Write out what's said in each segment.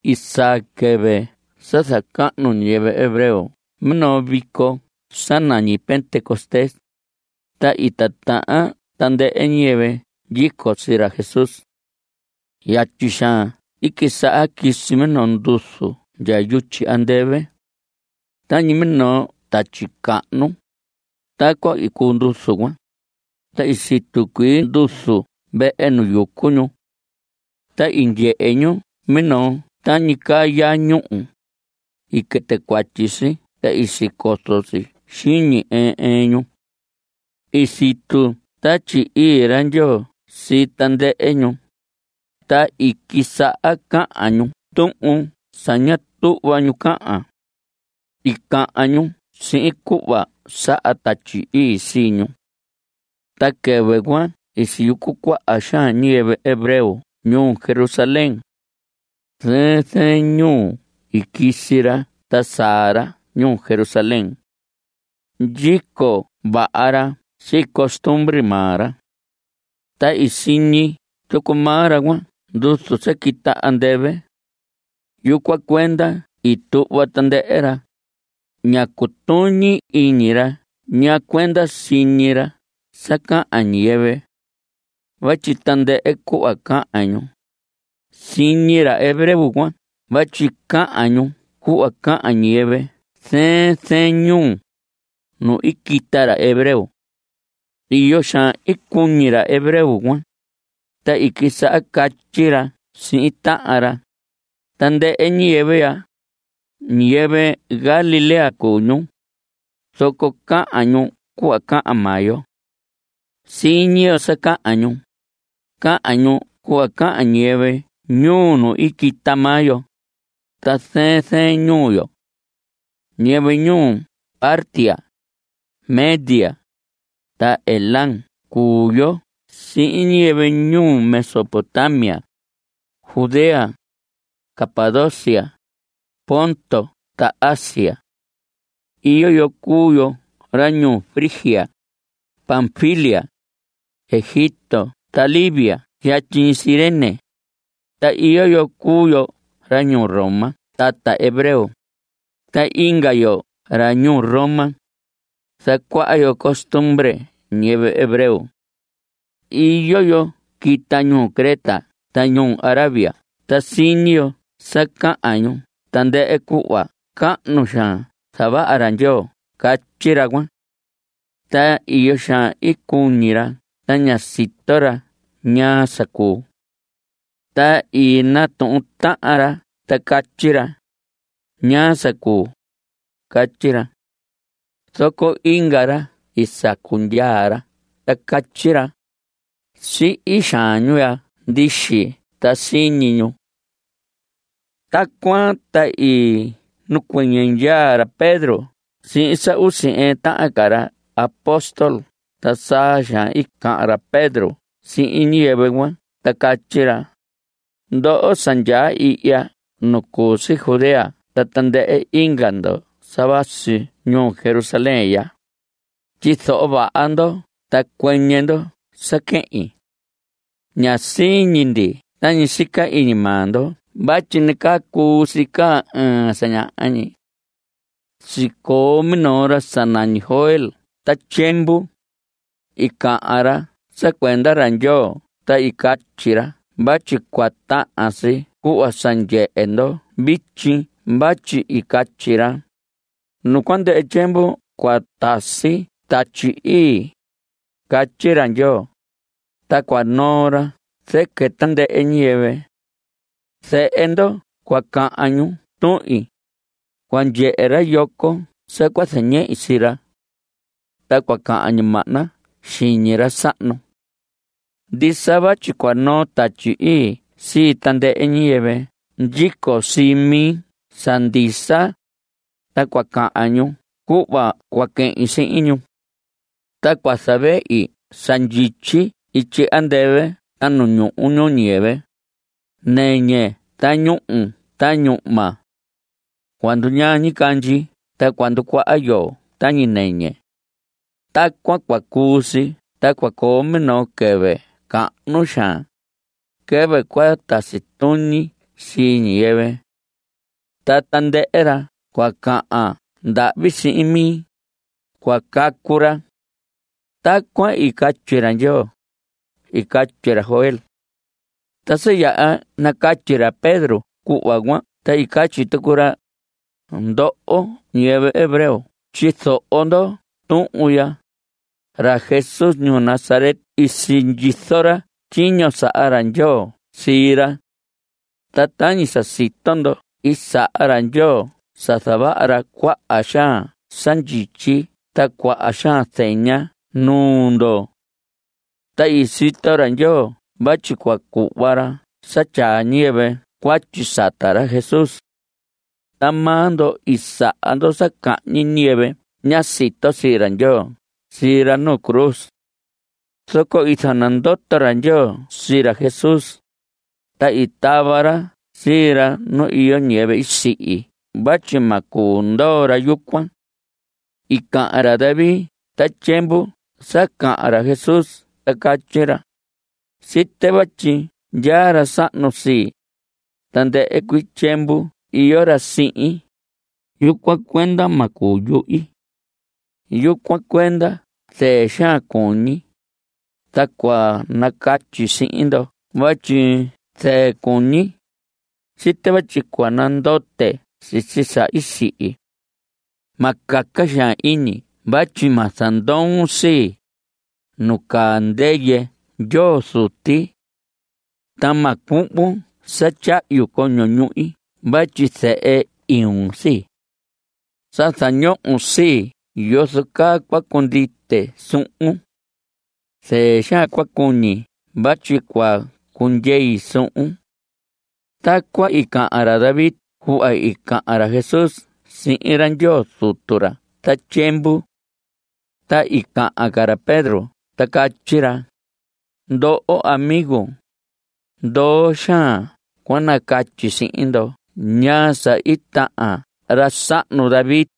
I saa quɨvɨ sa zacahnu ñiyɨvɨ hebreo minoo vico sa nañi Pentecostés, ta i titahan tandɨhɨ ñiyɨvɨ ndyico sii ra Jesús. Yatyi xaan i quisaha quisi minoo nduzu ndya yutyi andɨvɨ. Tañi minoo tatyi cahnu, tacuan i cuu nduzu cuan, ta i situ cuii nduzu vehe nu yucu ñu. Ta i ndyehe ñu minoo tañi caa yaa ñuhu. I quɨtɨ cuatyi si ta i sicozo si xiñi ɨɨn ɨɨn ñu. I situ Tatyi Ii ra Ndyoo sii tandɨhɨ ñu, ta i quisaha cahan ñu tuhun sa ña tuhva ñu cahan. I cahan ñu sihin cuhva saha Tatyi Ii sii ñu. Ta quɨvɨ cuan i siyucu cuaha xaan ñiyɨvɨ hebreo ñuu Jerusalén. Zɨɨn zɨɨn ñuu i quisi ra ta saa ra ñuu Jerusalén. Ndyico vaha ra sii costumbre maa ra. Ta i siñi tucu maa ra cuan nduzu sa quita andɨvɨ. Yucuan cuenda i tuhva tandɨhɨ ra. Ñá cutuñi iñi ra ñaa cuenda siñi ra sa cahan ñiyɨvɨ. Vatyi tandɨhɨ cuhva cahan ñu, siñi ra hebreo cuan vatyi cahan ñu cuhva cahan ñiyɨvɨ zɨɨn zɨɨn ñuu, nu i quita ra hebreo. Iyo xaan i cuñi ra hebreo cuan, ta i quisaha catyi ra sihin tahan ra: Tandɨhɨ ñiyɨvɨ ya, ñiyɨvɨ Galilea cuu ñu, zoco cahan ñu cuhva cahan maa yo. Siñi yo sa cahan ñu. Cahan ñu cuhva cahan ñiyɨvɨ ñuu nu quita maa yo, ta zɨɨn zɨɨn ñuu yo. Ñiyɨvɨ ñuu Partia, Media, ta Elam cuu yo sihin ñiyɨvɨ ñuu Mesopotamia, Judea, Capadocia, Ponto ta Asia. Iyo yo cuu yo ra ñuu Frigia, Panfilia, Egipto ta Libia yatyi ñi Cirene, ta iyo yo cuu yo ra ñuu Roma tata hebreo, ta inga yo ra ñuu Roma, zacuaha yo costumbre ñiyɨvɨ hebreo. Iyo yo quita ñuu Creta ta ñuu Arabia ta siñi yo sa cahan ñu tandɨhɨ cuhva cahnu xaan zavaha ra Ndyoo. Catyi ra cuan. Ta iyo xaan i cuñi ra ta ñá sito ra ñaa sa cuu. Ta i natuhun tahan ra ta catyi ra: ¿Ñaa sa cuu? Catyi ra. Zoco inga ra i sacu ndyaa ta catyi ra: Sihi xaan ñu ya ndixi (ta siñi ñu). Tacuan ta i nacuɨñɨ ndyaa ra Pedro sihin sa usi ɨɨn tahan ca ra apóstol ta saa xaan i cahan ra Pedro sihin ñiyɨvɨ cuan ta catyi ra: Ndoho sa ndyaa ihya nu cu si Judea ta tandɨhɨ inga ndo sa vasi ñuu Jerusalén ya, tyizoho vaha ndo ta cuɨñɨ ndo sa quehin. Ña siñi ndi tañi sica iñi maa ndo vatyi nacaa cuu si caa ɨɨn sa ñaha ñi. Sicoo minoo ra sinañi Joel ta tyiemvu. I cahan ra sa cuenda ra Ndyoo ta i catyi ra vatyi cua tahan si cuhva sa ndyehe ndo vityi vatyi i catyi ra: Nu cua ndɨhɨ tyiemvu cua tasi Tatyi Ii, catyi ra Ndyoo, ta cua noo ra zɨquɨ tandɨhɨ ñiyɨvɨ. Zehe ndo cua cahan ñu tuhin. Cua ndyehe ra yoco sa cua zañehi sii ra. Ta cua cahan ñimahna xiñi ra sahnu. Ndisa, vatyi cua noo Tatyi Ii sii tandɨhɨ ñiyɨvɨ ndyico sii mi sa ndisa, ta cua cahan ñu cuhva cua quehin sihin ñu. Ta cua zavehi sa ndyityi ityi andɨvɨ ta nu ñuhu ñuu ñiyɨvɨ. Nɨñɨ ta ñuhu ta ñuhma. Cua nduñaa ñicandyi ta cua nducuaha yoo tañi nɨñɨ. Tacuan cua cuu si ta cua coo minoo quɨvɨ cahnu xaan, quɨvɨ cua tasi tuñi sii ñiyɨvɨ. Ta tandɨhɨ ra cua cahan ndahvi sihin mi, cua cacu ra. Tacuan i catyi ra Ndyoo, i catyi ra Joel. Ta sa yaha nacatyi ra Pedro cuhva cuan ta i catyi tucu ra: Ndoho, ñiyɨvɨ hebreo tyizoho ndo tuhun ya: Ra Jesús ñuu Nazaret i sindyizo ra tyiño saha ra Ndyoo sii ra. Ta tañi sa sito ndo i saha ra Ndyoo sa zavaha ra cuaha xaan sa ndyityi ta cuaha xaan zeña nuu ndo. Ta i sito ra Ndyoo vatyi cua cuhva ra sa tyaa ñiyɨvɨ cuatyi sata ra Jesús. Ta maa ndo i saha ndo sa cahñi ñiyɨvɨ ña sito sii ra Ndyoo sii ra nu cruz. Zoco i zanandoto ra Ndyoo sii ra Jesús, ta i tava ra sii ra nu iyo ñɨyɨvɨ i sihi vatyi ma cuu ndoo ra yucuan. I cahan ra David ta tyiemvu sa cahan ra Jesús ta catyi ra: Site vatyi ndyaa ra sahnu sihin. Tandɨhɨ cuii tyiemvu iyo ra sihin. Yucuan cuenda ma cuyuhi. Yucuan cuenda zɨɨ xaan cuñi, ta cua nacatyi sihin ndo vatyi zɨɨ cuñi. Site vatyi cua nandote sisi sa i sihi. Ma caca xaan iñi vatyi ma zandoon sii, nu caa ndɨyɨ Ndyoo Zuti. Ta ma cuhvon sa tyahyu coño ñuhi vatyi zehe iun sii. Sa zañohon sii yozo caa cua cundite suhun. Zɨɨ xaan cua cuñi vatyi cua cundyei suhun. Tacuan i cahan ra David cuhva i cahan ra Jesús sihin ra Ndyoo Zutu ra ta tyiemvu. Ta i cahan ca ra Pedro ta catyi ra: Ndoho amigos, ndoo xaan cua nacatyi sihin ndo ñaa sa i tahan ra sahnu David,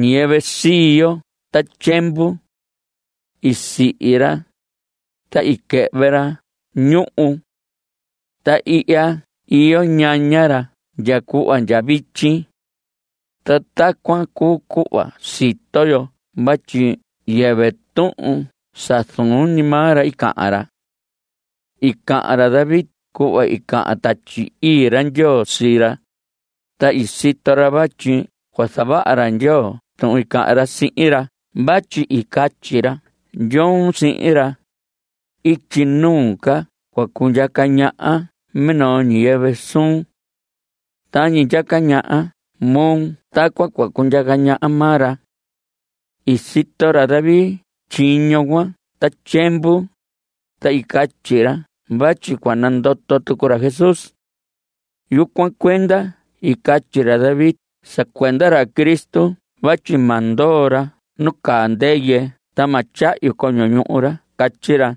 ñiyɨvɨ sii yo ta tyiemvu. I sihi ra, ta i quɨhvɨ ra ñuhu. Ta ihya iyo ñaña ra ndya cuhva ndya vityi. Ta tacuan cuu cuhva sito yo vatyi yɨvɨ tuhun sa zuun ñi maa ra cahan ra. I cahan ra David cuhva i cahan Tatyi Ii ra Ndyoo sihin ra, ta i sito ra vatyi cua zavaha ra Ndyoo tuhun i cahan ra sihin ra vatyi i catyi ra Ndyoo sihin ra: “Ityi nuu ca cua cundyaca ñaha minoo ñiyɨvɨ suun. Tañi ndyaca ñaha moo tacuan cua cundyaca ñaha maa ra.” I sito ra David tyiño cuan ta tyiemvu, ta i catyi ra vatyi cua nandoto tucu ra Jesús. Yucuan cuenda i catyi ra David sa cuenda ra Cristo vatyi ma ndoo ra nu caa ndɨyɨ. Ta ma tyahyu coño ñuhu ra. Catyi ra.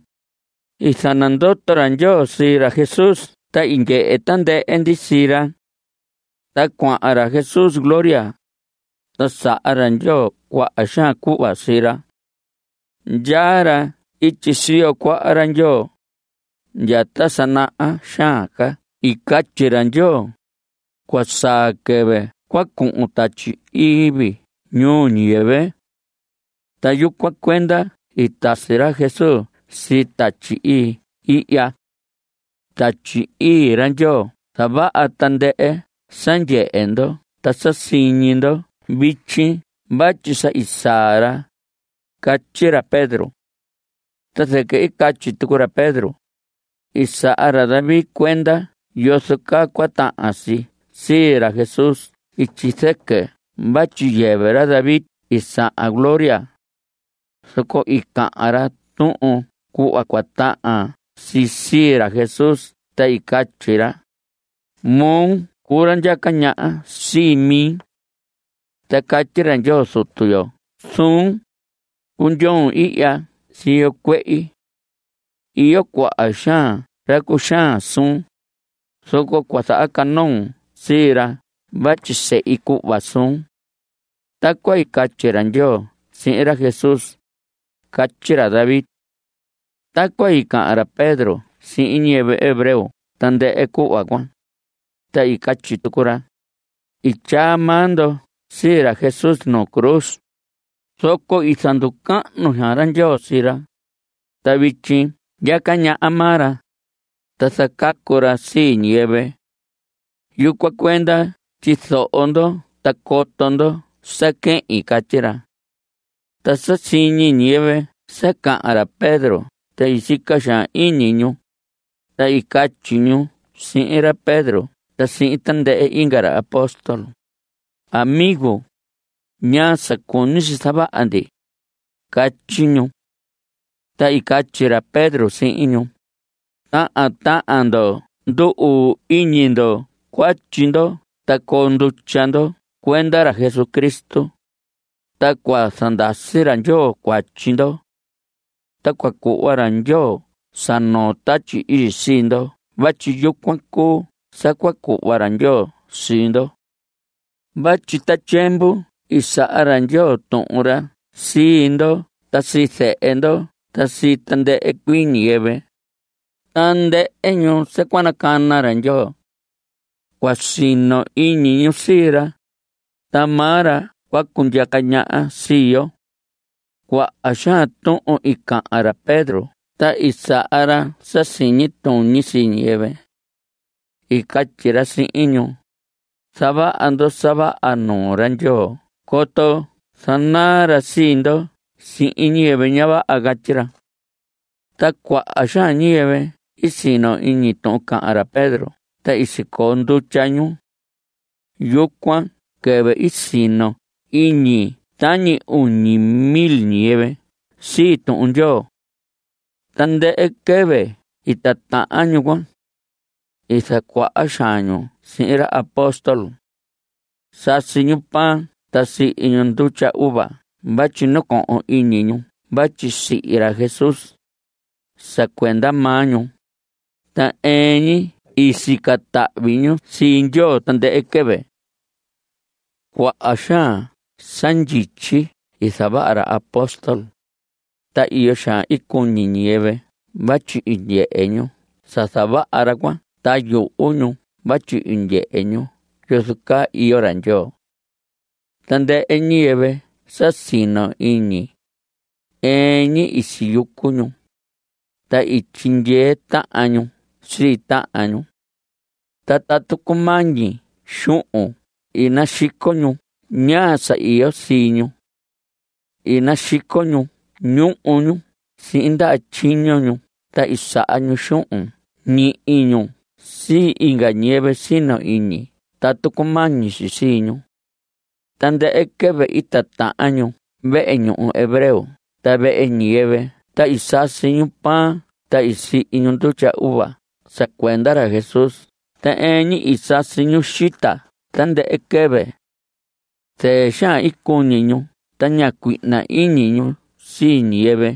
I zanandoto ra Ndyoo sii ra Jesús ta i ndyehe tandɨhɨ ndi sii ra. Ta cuahan ra Jesús gloria, ta saha ra Ndyoo cuaha xaan cuhva sii ra. Ndyaa ra ityi siyo cuaha ra Ndyoo. Ndya ta sa naha xaan ca i catyi ra Ndyoo: “Cua saa quɨvɨ cua cuhun Tatyi Ii vii ñuu ñiyɨvɨ.” Ta yucuan cuenda i tasi ra Jesús sii Tatyi Ii ihya. Tatyi Ii ra Ndyoo zavaha tandɨhɨ sa ndyehe ndo ta sa siñi ndo vityi vatyi sa i saa ra. Catyi ra Pedro. Ta zɨquɨ i catyi tucu ra Pedro: I saha ra David cuenda yozo caa cua tahan si sii ra Jesús ityi zɨquɨ vatyi yɨvɨ ra David i sahan gloria. Zoco i cahan ra tuhun cuhva cua tahan si sii ra Jesús ta i catyi ra: Moo cuu ra ndyaca ñaha sii mi. Ta catyi ra Ndyoo Zutu yo suhun: “Cundyoon ihya siyo cuehi. Iyo cuaha xaan ra cuxaan suun, zoco cua zahacanoon sii ra vatyi sehi cuhva suun.” Tacuan i catyi ra Ndyoo sihin ra Jesús, catyi ra David. Tacuan i cahan ra Pedro sihin ñiyɨvɨ hebreo tandɨhɨ cuhva cuan, ta i catyi tucu ra: I tyaa maa ndo sii ra Jesús nu cruz, zoco i zanducahnu xaan ra Ndyoo sii ra, ta vityi ndyaca ñaha maa ra, ta zacacu ra sii ñiyɨvɨ. Yucuan cuenda tyizoho ndo ta coto ndo sa quehin. Catyi ra. Ta sa siñi ñiyɨvɨ sa cahan ra Pedro ta i sica xaan iñi ñu, ta i catyi ñu sihin ra Pedro ta sihin tandɨhɨ inga ra apóstol: ¿Amigo, ñaa sa cuñi si zavaha ndi? Catyi ñu. Ta i catyi ra Pedro sihin ñu: Tahan tahan ndo ndu‑uu iñi ndo cuatyi ndo ta coo ndutya ndo cuenda ra Jesucristo, ta cua zandasi ra Ndyoo cuatyi ndo. Ta cua cuhva ra Ndyoo sa noo Tatyi Ii sii ndo vatyi yucuan cuu sa cua cuhva ra Ndyoo sii ndo. Vatyi ta tyiemvu i saha ra Ndyoo tuhun ra sii ndo ta sii zehe ndo ta sii tandɨhɨ cuii ñiyɨvɨ, tandɨhɨ ñu sa cua nacana ra Ndyoo. Cua sino iñi ñu sii ra. Ta maa ra cua cundyaca ñaha sii yo. Cuaha xaan tuhun i cahan ra Pedro ta i saha ra sa siñi tuñi sii ñiyɨvɨ. I catyi ra sihin ñu: Zavaha ndo sa vaha nuu ra Ndyoo coto zanaa ra sii ndo sihin ñiyɨvɨ ña vaha. Catyi ra. Ta cuaha xaan ñiyɨvɨ i sino iñi tuhun cahan ra Pedro ta i sicoo ndutya ñu. Yucuan quɨvɨ i sino iñi tañi uñi mil ñiyɨvɨ sii Tuhun Ndyoo. Tandɨhɨ quɨvɨ i titahan ñu cuan. I zacuaha xaan ñu sihin ra apóstol. Sasi ñu pan ta sihi ñu ndutya uva vatyi nacohon iñi ñu vatyi sihi ra Jesús, sa cuenda maa ñu, ta ɨɨn ñi i sica tahvi ñu sii Ndyoo tandɨhɨ quɨvɨ. Cuaha xaan sa ndyityi i zavaha ra apóstol, ta iyo xaan i cuñi ñiyɨvɨ vatyi i ndyehe ñu sa zavaha ra cuan ta yuhu ñu vatyi i ndyehe ñu yozo caa iyo ra Ndyoo. Tandɨhɨ ñiyɨvɨ sa sino iñi, ɨɨn ñi i siyucu ñu, ta i tyindyee tahan ñu sii tahan ñu. Ta tatu cumañi xuhun i naxico ñu ñaa sa iyo sii ñu. I naxico ñu ñuhu ñu sihin ndaha tyiño ñu ta i saha ñu xuhun ñihi ñu sii inga ñiyɨvɨ sino iñi tatu cumañi si sii ñu. Tandɨhɨ quɨvɨ i titahan ñu vehe ñuhu hebreo ta vehe ñiyɨvɨ ta i sasi ñu pan ta sihi ñu ndutya uva sa cuenda ra Jesús ta ɨɨn ñi i sasi ñu xita tandɨhɨ quɨvɨ. Zɨɨ xaan i cuñi ñu ta ña cuihna iñi ñu sii ñiyɨvɨ.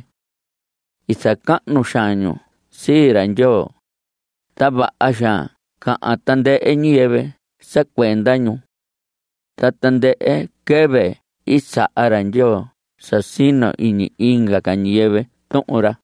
I zacahnu xaan ñu sii ra Ndyoo, ta vaha xaan cahan tandɨhɨ ñiyɨvɨ sa cuenda ñu. Ta tandɨhɨ quɨvɨ i saha ra Ndyoo sa sino iñi inga ca ñiyɨvɨ Tuhun ra.